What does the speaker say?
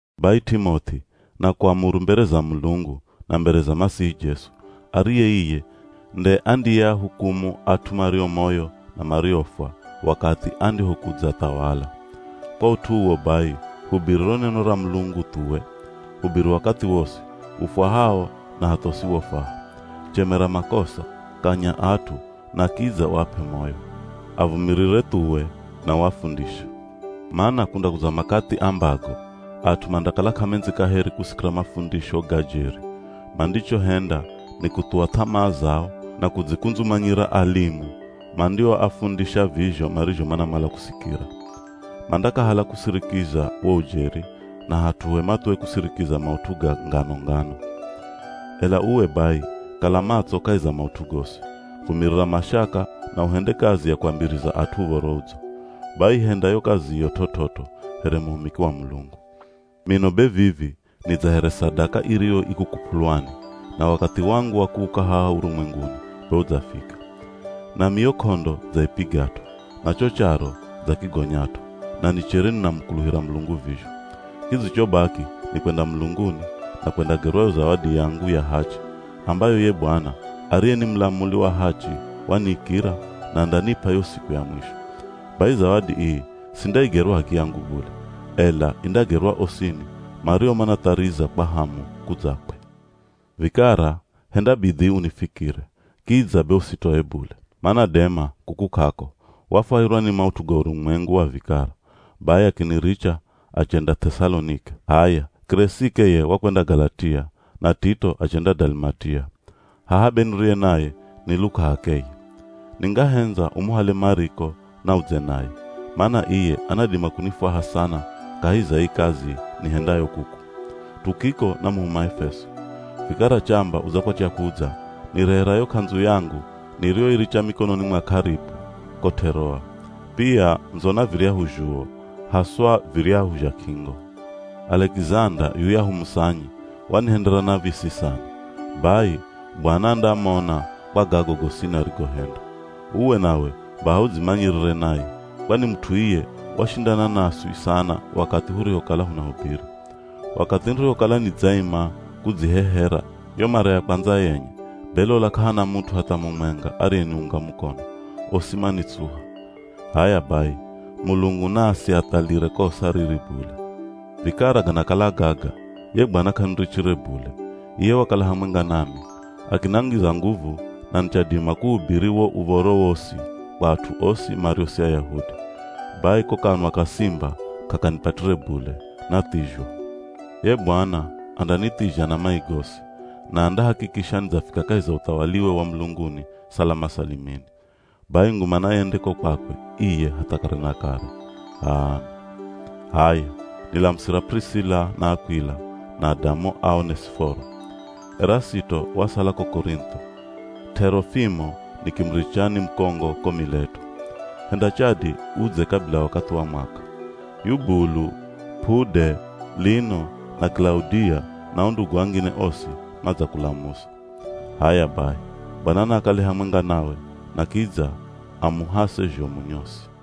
Bai T'imoth'i nakuamuru mbere za Mulungu na mbere za Masihi Jesu, ariye iye nde andiyeahukumu at'u mario moyo na mariofwa wakathi andihokudzathawala. Kwa ut'u uwo bai hubiri ro neno ra Mulungu thuwe. Hubiri wakathi wosi, ufwahao na hatha usiwofwaha. Chemera makosa, kanya at'u, na kidza uap'e moyo. Avumirire thuwe na uafundishe. Mana kundakudza makathi ambago at'u mandakala k'amendzi kaheri kusikira mafundisho ga jeri, mandichohenda ni kuthuwa th'amaa zao na kudzikundzumanyira alimu mandioafundisha vizho marizho manamala kusikira. Mandakahala kusirikiza wo ujeri na hat'uhe mathuwe kusirikiza maut'u ga ngano-ngano. Ela uwe bai kala matso kahi za maut'u gosi, vumirira mashaka na uhende kazi ya kuambiriza at'u Uv̱oro Udzo. Bai henda yo kaziyo t'ot'ot'o here muhumiki wa Mulungu. Mino be vivi ni dza here sadaka iriyo ikukup'ulwani na wakathi wangu wa kuuka haha urumwenguni be udzafika. Nami yo k'ondo dzaipigat'o, na cho charo dzakigonyat'o na nichere ninamukuluhira Mulungu vizho. Kidzichobaki ni kwenda mulunguni, na kwendagerwa yo zawadi yangu ya hachi, ambayo ye Bwana, ariye ni mulamuli wa hachi waniikira na andanip'a yo siku ya mwisho. Bai zawadi ii sindaigerwa h'akiyangu bule, ela indagerwa osini mario manathariza kwa hamu, kudzakwe. Vikara, henda bidhii unifikire, kidza be usitoe bule. Mana Dema, kuku k'ako, wafwahirwa ni maut'u ga urumwengu wa vikara, bai akiniricha achenda Th'esalonike. H'aya Kiresike ye wakwenda Galatia na Tito achenda Dalimatia. Haha be niriye naye ni Luka h'akeye. Ningahendza umuhale Mariko na udze naye, mana iye anadima kunifwaha sana kahi za ii kazi nihendayo kuku. Tukiko namuhuma Efeso. Vikara chamba udzakwatya kudza, nirehera yo k'andzu yangu niriyoiricha mikononi mwa Karipo, ko T'eroa. Pia ndzo na viryahu zhuwo, haswa viryahu zha k'ingo. Alekizanda, yuyahu musanyi, wanihendera nav̱isi sana. Bai Bwana andamona kwa gago gosini arigohenda. Uwe nawe, baha udzimanyirire naye, kwani mut'u iye washindana naswi sana wakathi hurihokala hunahubiri. Wakathi nirihokala nidzaima kudzihehera, yo mara ya kwandza yenye, be lola k'ahana mut'u hatha mumwenga ariyeniunga mukono, osi manitsuha. H'aya bai, Mulungu na asiathalire kosa riri bule. Vikara ganakala gaga, ye Bwana k'anirichire bule iye wakala hamwenga nami, akinangiza nguvu na nichadima kuhubiri wo Uv̱oro wosi kwa at'u osi mario si Ayahudi. Bai ko kanwa ka simba k'akanipatire bule, nathizhwa. Ye Bwana andanithizha na mai gosi, na andahakikisha nidzafika kahi za uthawaliwe wa mulunguni salama salimini. Bai nguma nayende ko kwakwe iye hatha kare na kare! H'aami. H'aya, nilamusira P'urisila na Akw'ila na adamu a Onesiforo. Erasito wasala ko Korintho, T'erofimo nikimuricha ni mukongo ko Mileto. Henda chadi udze kabila wakathi wa mwaka. Yubulu, P'ude, Lino na Kilaudia na o ndugu angine osi madzakulamusa. H'aya bai, Bwana naakale hamwenga nawe na kidza amuhase zhomu nyosi.